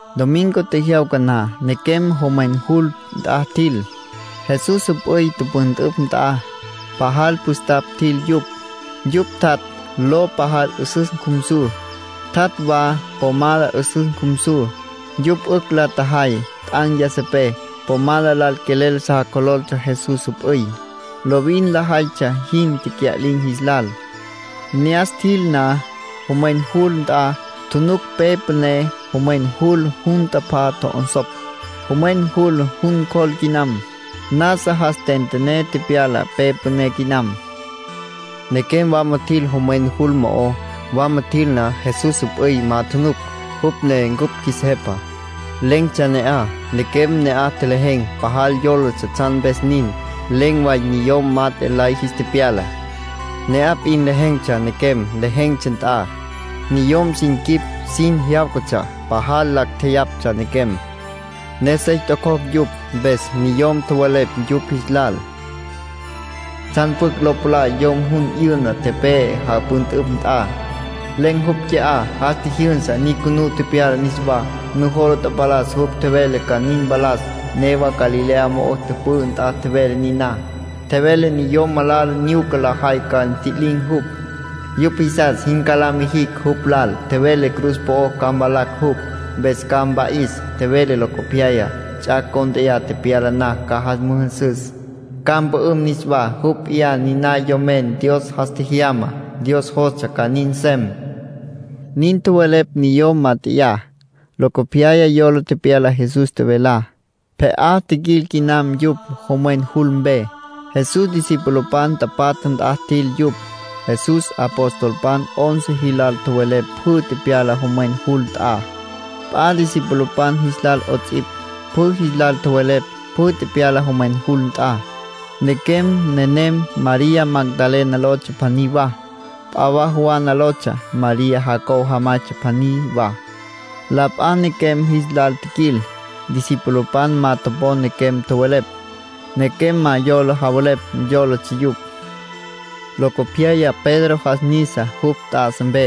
Domingo tjejyawca na, nequem jomwen jul nt'a tjil, Jesús jüp'üy tüpüntüpj nt'a. Pajal püstapj tjil yupj. Yupj tjat' lo pajal 'üsüs cjumsu, tjat' wa pomada 'üsüs cjumsu, yupj 'ücj la tjajay t'an̈ yasapé. Pomada lal quelel sa cjololtsja Jesús jüp'üy, lovin lajaytsja jin tecya'lin̈ jis lal. Ne'as tjil na, jomwen jul nt'a, tjunuc pe püné jomwen jul jun tapá tjo'onsopj; jomwen jul jun cjol quinam. Nasa jas tentené tepyala pe püné quinam. Nequem wama tjil jomwen jul mo'ó. Wama tjil na, Jesús jüp'üy ma tjunuc, jupj ne cupj qjuis Jepa. Len̈tsja ne'aj. Nequem ne'aj tjelejen̈, pajal yólatsja tsjan mpes nin. Len̈ way niyom mat'e lay jis tepyala, ne'aj p'in lejen̈tsja nequem lejen̈tsja nt'a. Niyom sin quip sin jyáwcatsja. Pajal lacj tjeyapj nequem, ne sey tococj yupj. Mpes niyom tjowelepj yupj jis lal: —¿Tsjan pjucj lo palá yom jun 'yüna tepe'e japüntüpj nt'a? Len̈ jupj qui'á. Jas tjijyünsa. Nyucunú tepyala niswá. Nujola tapalas jupj tjevele ca nin mpalas; newa Galilea mo'o tüpü'ü na tjevele niná. Tjevele niyom malala nyuca lajay ca ntji'lin̈ jupj, yupj jisas jin ca mijicj jupj lal. Tjevele cruz po'o ca mvalacj jupj, mpes ca mpa'is. Tjevele locopyaya, ts'ac' cont'e tepyala na, ca jas müjünsüs, ca mpü'üm niswá. Jupj p'iyá niná Yomen Dios jas tjejyamá. Dios jostsja ca nin nsem —nin tjowelepj niyom mat'eyá. Locopyas yola tepyala Jesús tjevelá. Pje'á tjiquil quinam yupj, jomwen jul mpe. Jesús discipulopan tapatja nt'a tjil yupj. Jesús apostolpan once jilal tjowelepj pjü tepyalá jomwen jul nt'a. P'a discipulopan jis lal 'ots'ipj, pjü jis lal tjowelepj pjü tepyalá jomwen jul nt'a. Nequem nenem María Magdalena lotsja pjaní wa, p'a wa Juana lotsja, María Jacobo jamaytsja pjaní wa. La p'a nequem jis lal tjiquil. Discipulopan ma topon nequem tjowelepj. Nequem ma yola javelepj yólatsja yupj. Locopyaya Pedro jas nisa jupj tjá'asa mpe,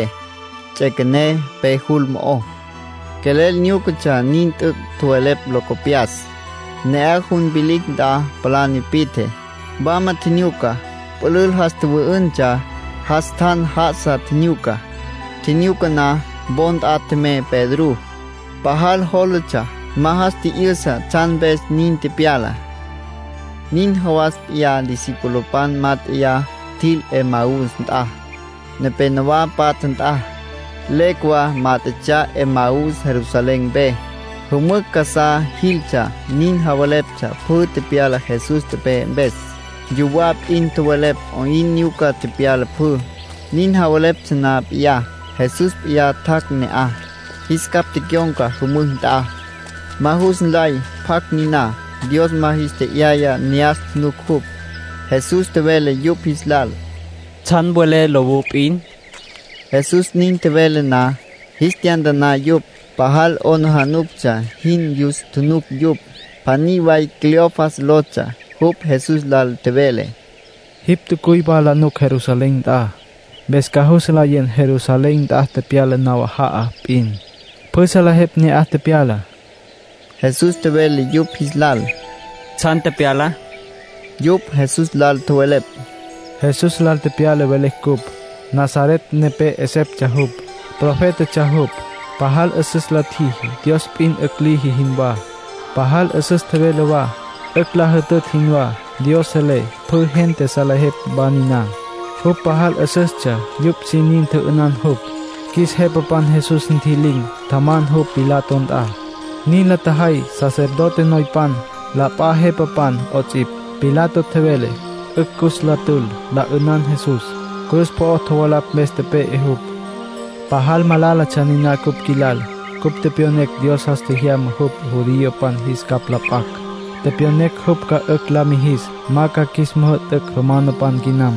ts'üequené pe jul mo'ó. Quelel nyúcatsja min t'üc' tjowelepj locopyas. Ne'aj jun vilicj nt'a palá nipi'tje, wama tjinyuca. Pülül jas tjüwü'üntsja jas tjan já'asa tjinyuca. Tjinyuca na, wo nt'a tjemey Pedrú. Pajal jólatsja, ma jas tji'yüsa tsjan mpes nin tepyala. Nin jawas p'iyá discipulopan mát'eya tjil Emaús nt'a, nepénowa patja nt'a. Legua mát'etsja Emaús Jerusalén mpe. Jümücj casá jiltsja, nin javeleptsja pjü tepyalá Jesús tepe'e mpes. Yuwá p'in tjowelepj 'oyn nyuca tepyala pjü. Nin javeleptsja na p'iyá, Jesús p'iyá tjac' ne'aj, jis capj tecyon̈ca jümücj nt'a. Ma jus nlay pjacj niná. Dios ma jis tje'yaya ne'as tjunuc jupj. Jesús tjevele yupj jis lal: —¿Tsjan welé lowú p'in? Jesús nin tjevele na, jis tyantaná yupj, pajal 'aplijila jin yus tjunuc yupj. Pjaní way Cleofas lotsja. Jupj Jesús lal tjevele: —Jipj tjacuy wa la nuc Jerusalén nt'a, mpes ca jus nlayen Jerusalén nt'a tepyalá nawaja'a p'in. Pjü salejepj ne'aj tepyalá. Jesús tjevele yupj jis lal: —¿Tsjan tepyala? Yupj Jesús lal tjowelepj: —Jesús lal tepyalá velecj cupj. Nazaret nepé 'eseptsja jupj. Profétatsja jupj. Pajal 'üsüs la tjiji, Dios p'in 'ücj liji jinwá. Pajal 'üsüs tjevele wa, 'ücj la jütütj jinwá. Dios selé. Pjü gente salejepj wa niná. Jupj pajal 'üsüstsja, yupj sin nin tjü'ünan jupj. Qjuis jepapan Jesús ntji'lin̈, tjaman jupj Pilato nt'a. Nin la tjajay sacerdote noypan, la p'a jepapan 'ots'ipj. Pilato tjevele 'ücj cus la tül, la 'ünan Jesús. Cruz po'o tjovalapj mpes tepe'e jupj. Pajal malálatsja niná cupj qjuilal. Cupj tepyonecj Dios jas tjejyama jupj judiopan jis capj la p'acj. Tepyonecj jupj ca 'ücj la mijis ma ca qjuis müjü'tücj romanopan quinam.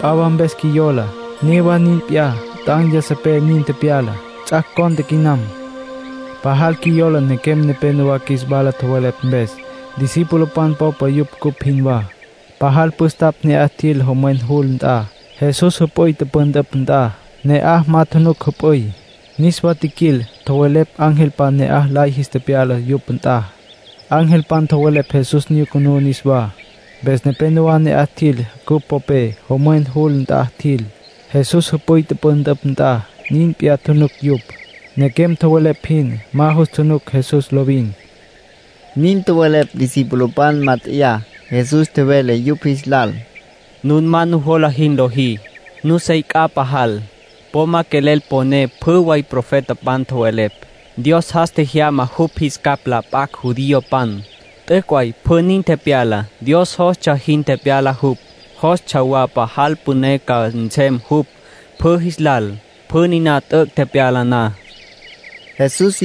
P'a wa mpes qjuiyola: newa nin p'iyá; t'an̈ yasapé nin tepyala. Ts'ac' cont'e quinam. ”Pajal qjuiyola nequem nepénowa qjuis wala tjowelepj mpes. Discipulopan popa yupj, cupj jinwá. Pajal püstapj ne'as tjil jomwen jul nt'a, Jesús jüp'üy tüpüntüpj nt'a. Ne'aj ma tjunuc jüp'üy. Niswa tjiquil, tjowelepj angelpan ne'aj lay jis tepyala yupj nt'a. Angelpan tjowelepj Jesús nyucunú niswá. Mpes nepénowa ne'aj tjil cupj popé, jomwen jul nt'a tjil, Jesús jüp'üy tüpüntüpj nt'a. Nin p'iyá tjunuc yupj, nequem tjowelepj jin. Ma jus tjunuc Jesús lovin —nin tjowelepj discipulopan mát'eya. Jesús tjevele yupj jis lal: —Nun ma nujola jinwá lojí. Nusey c'a pajal. Po ma quelel poné pjü way profetapan tjowelepj. Dios jas tjejyama jupj jis capj la p'acj judiopan. T'üc' way pjü nin tepyala, Dios jostsja jin tepyala jupj. Jostsja wa pajal püné ca nsem jupj pjü jis lal, pjü niná t'üc' tepyala na —tjevele Jesús.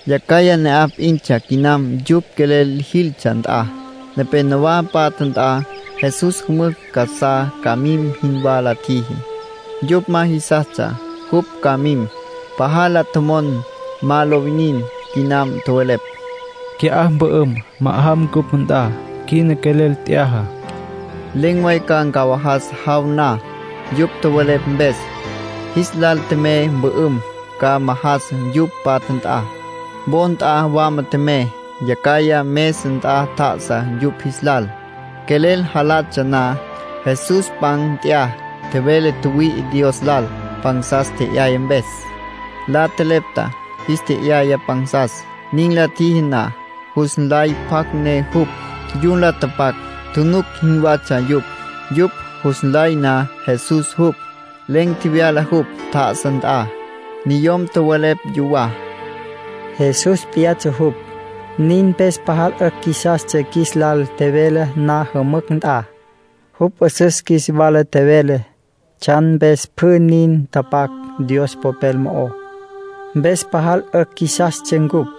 Yacjaya ne'aj p'intsja quinam yupj quelel jiltsja nt'a, nepénowa patja nt'a. Jesús jümücj casá ca mim jinwá la tjiji. Yupj ma jisastsja jupj ca mim. Pajal la tjomon ma lo winin quinam. Tjowelepj: —Qui'á mpü'üm, majan ncupj nt'a. Quina quelel t'yaja. Len̈ way ca ncawajas jaw na. Yupj tjowelepj mpes, jis lal tjemey mpü'üm, ca majas yupj patja nt'a. Wo nt'a wama tjemey. Yacjaya mesa nt'a tjá'asa yupj jis lal, quelel jalatsja na. Jesús pan nt'ya, tjevele tjüwüi'i Dios lal pansas tje'yaya mpes. La tjelepta, jis tje'yaya pansas. Nin la tjiji na, jus nlay pjacj ne jupj. Yun la tapacj tjunuc jinwatsja yupj. Yupj jus nlay na Jesús jupj, len̈ tjevyala jupj, tjá'asa nt'a. Niyom tjowelepj yuwá: —Jesús p'iyatsja jupj. Nin mpes pajal 'ücj qjuisastsja qjuis lal tjevele na jümücj nt'a. Jupj 'üsüs qjuis wala tjevele tsjan mpes pjü nin tapac Dios Popel mo'ó, mpes pajal 'ücj qjuisastsja cupj.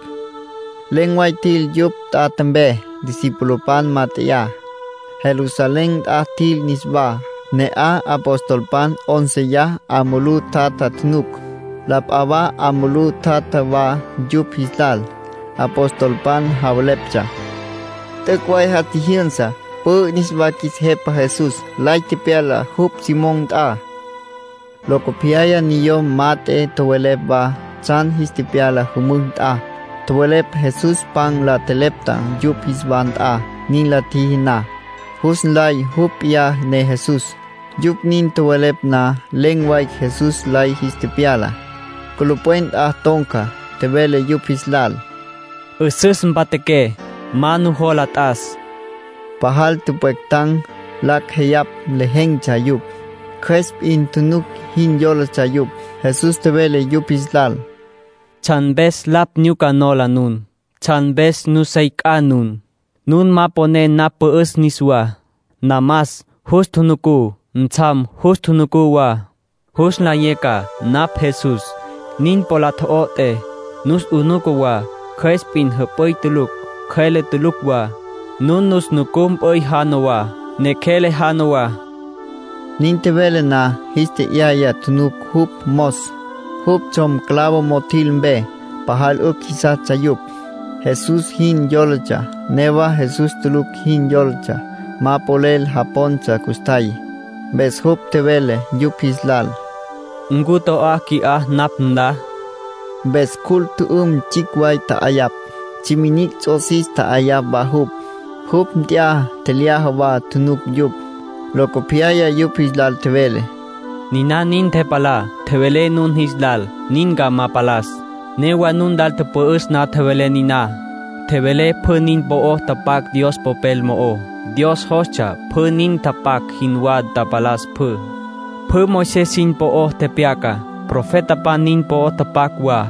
Len̈ way tjil yupj tjatja mpe, discipulopan mat'eyá. Jerusalén nt'a tjil niswá. Ne'aj apostolpan 'ónceya 'a mulú tjatja tjunuc. La p'a wa 'a mulú tjatja wa yupj jis lal. Apostolpan javeleptsja: “T'üc' way jas tjijyünsa, pü'ü niswá qjuis Jepa Jesús. Lay tepyala jupj Simón nt'a.” Locopyaya niyom mat'e tjowelepj wa tsjan jis tepyala jümücj nt'a. Tjowelepj Jesús pan la tjelepta yupj jis wa nt'a. Nin la tjiji na, jus nlay jupj p'iyá ne Jesús. Yupj nin tjowelepj na, len̈ way Jesús lay jis tepyala, culupwen nt'a ton̈ca. Tjevele yupj jis lal: —'Üsüs mpatjaqué; ma nujola t'as. Pajal tüpwectan̈, lacj jeyapj lejen̈tsja yupj. Cjües p'in tjunuc jin yólatsja yupj. Jesús tjevele yupj jis lal: —¿Tsjan mpes lapj nyuca nujola nun? ¿Tsjan mpes nusey c'a nun? Nun ma poné napj pü'üs niswá. Namas jus tjunucú, ntsjam jus tjunucú wa. Jus nlayé ca napj Jesús. Nin po la tjo'ot'é, nus 'unuca wa. Cjües p'in jüp'üy tulucj, cjüele tulucj wa. Nun nus nucú mp'üy jana wa, neqjuele jana wa —tjevele Jesús. Nin tjevele na, jis tje'yaya tjunuc jupj mos, jupj tsjom, clavo mo'o tjil mpe. Pajal 'ücj jisastsja yupj. Jesús jin yólatsja, newa Jesús tulucj jin yólatsja. Ma polel japontsja custjay, mpes jupj tjevele yupj jis lal: —¿Ncu to'á qui'á napj nla? Mpes cjul tjü'üm tsjicj way tja'ayapj. Tsjiminicj ts'osis tja'ayapj wa jupj. Jupj nt'ya, tjelyaja wa tjunuc yupj. Locopyaya yupj jis lal tjevele: —Niná nin ntepalá tjevelé nun jis lal nin ca ma palas. Newa nun lal tüpü'üs na tjevelé niná. Tjevelé pjü nin po'o tapac Dios Popel mo'ó, Dios jostsja pjü nin tapac jinwá tapalas pjü. Pjü Moisés nin po'o tepyaca, profetapan nin po'o tapac wa,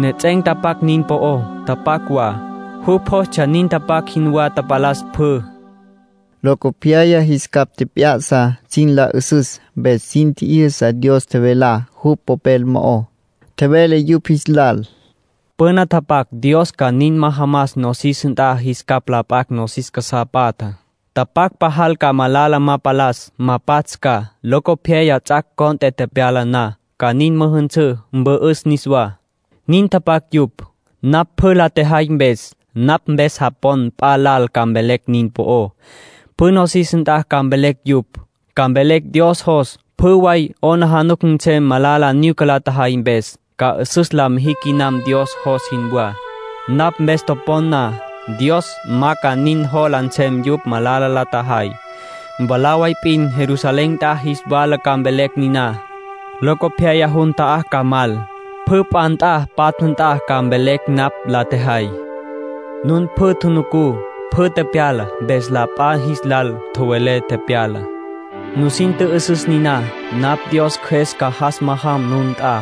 nejets'en̈ tapac nin po'o tapac wa, jupj jostsja nin tapac jinwá tapalas pjü —tjevele Jesús. Locopyaya jis capj tjep'ya'sa sin la 'üsüs, mpes sin tji'yüsa Dios tjevelá jupj Popel mo'ó. Tjevele yupj jis lal: —Püna tapac Dios ca nin majamas nosis nt'a jis capj la p'acj nosis casá patjá. Tapac pajal ca malala ma palas, ma pats' ca. Locopyaya ts'ac' cont'e tepyala na, ca nin müjünsǘ, mpü'üs niswá. Nin tapac yupj. Napj pjü la tjejay mpes, napj mpes japon p'a lal ca mvelecj nin po'ó. Pjü nosis nt'a ca mvelecj yupj. Ca mvelecj Dios jos pjü way 'aplijila nsem malala nyuca la tjajay mpes, ca 'üsüs la mijicj quinam Dios jos jinwá. Napj mpes topon na, Dios ma ca nin jola nsem yupj malala la tjajay. Mwalá way p'in Jerusalén nt'a jis wala ca mvelecj niná. Locopyaya jun ta'á ca mal, pjü p'a nt'a patja nt'a ca mvelecj napj la tjejay. ”Nun pjü tjunucú pjü tepyalá, mpes la p'a jis lal tjowelé tepyalá. Nusin tjü'üsüs niná: napj Dios Cjües ca jas majam nun nt'a.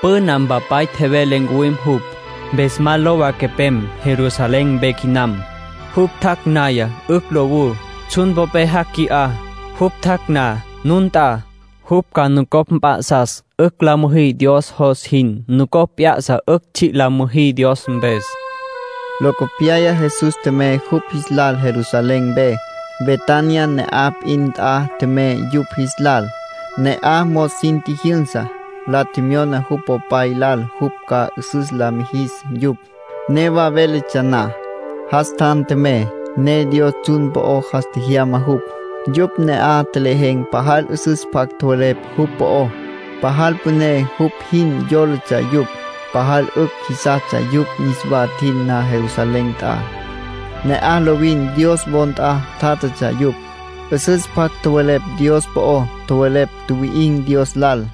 Püna Mpapay tjevele ncuwim jupj. Mpes ma lowa quepem, Jerusalén mpe quinam. Jupj tjac' naya, 'ücj lowú. Tsjun popé jac' qui'á. Jupj tjac' na nun nt'a, jupj ca nucopj mp'a'sas 'ücj la müjí Dios jos jin. Nucopj mp'a'sas 'ücj tsji' la müjí Dios mpes —tjevele Jesús. Locopyaya Jesús tjemey yupj jis lal Jerusalén mpe. Betania ne'aj p'in nt'a tjemey yupj jis lal. Ne'aj mos sin tjijyünsa, la tjemyona jupj Popay lal jupj ca 'üsüs lis mijis yupj. Newa véletsja na, jas tjan tjemey, ne Dios tsjun po'o jas tjemyana jupj. Yupj ne'aj tjelejen̈ pajal 'üsüs pjac tjowelepj jupj po'ó. Pajal püné jupj jin yólatsja yupj. Pajal 'ücj jisastsja yupj niswa tjil na Jerusalén nt'a. Ne'aj lovin Dios wo nt'a tjátjatsja yupj, 'üsüs pjac tjowelepj Dios po'ó, tjowelepj tjuwi'in̈ Dios lal.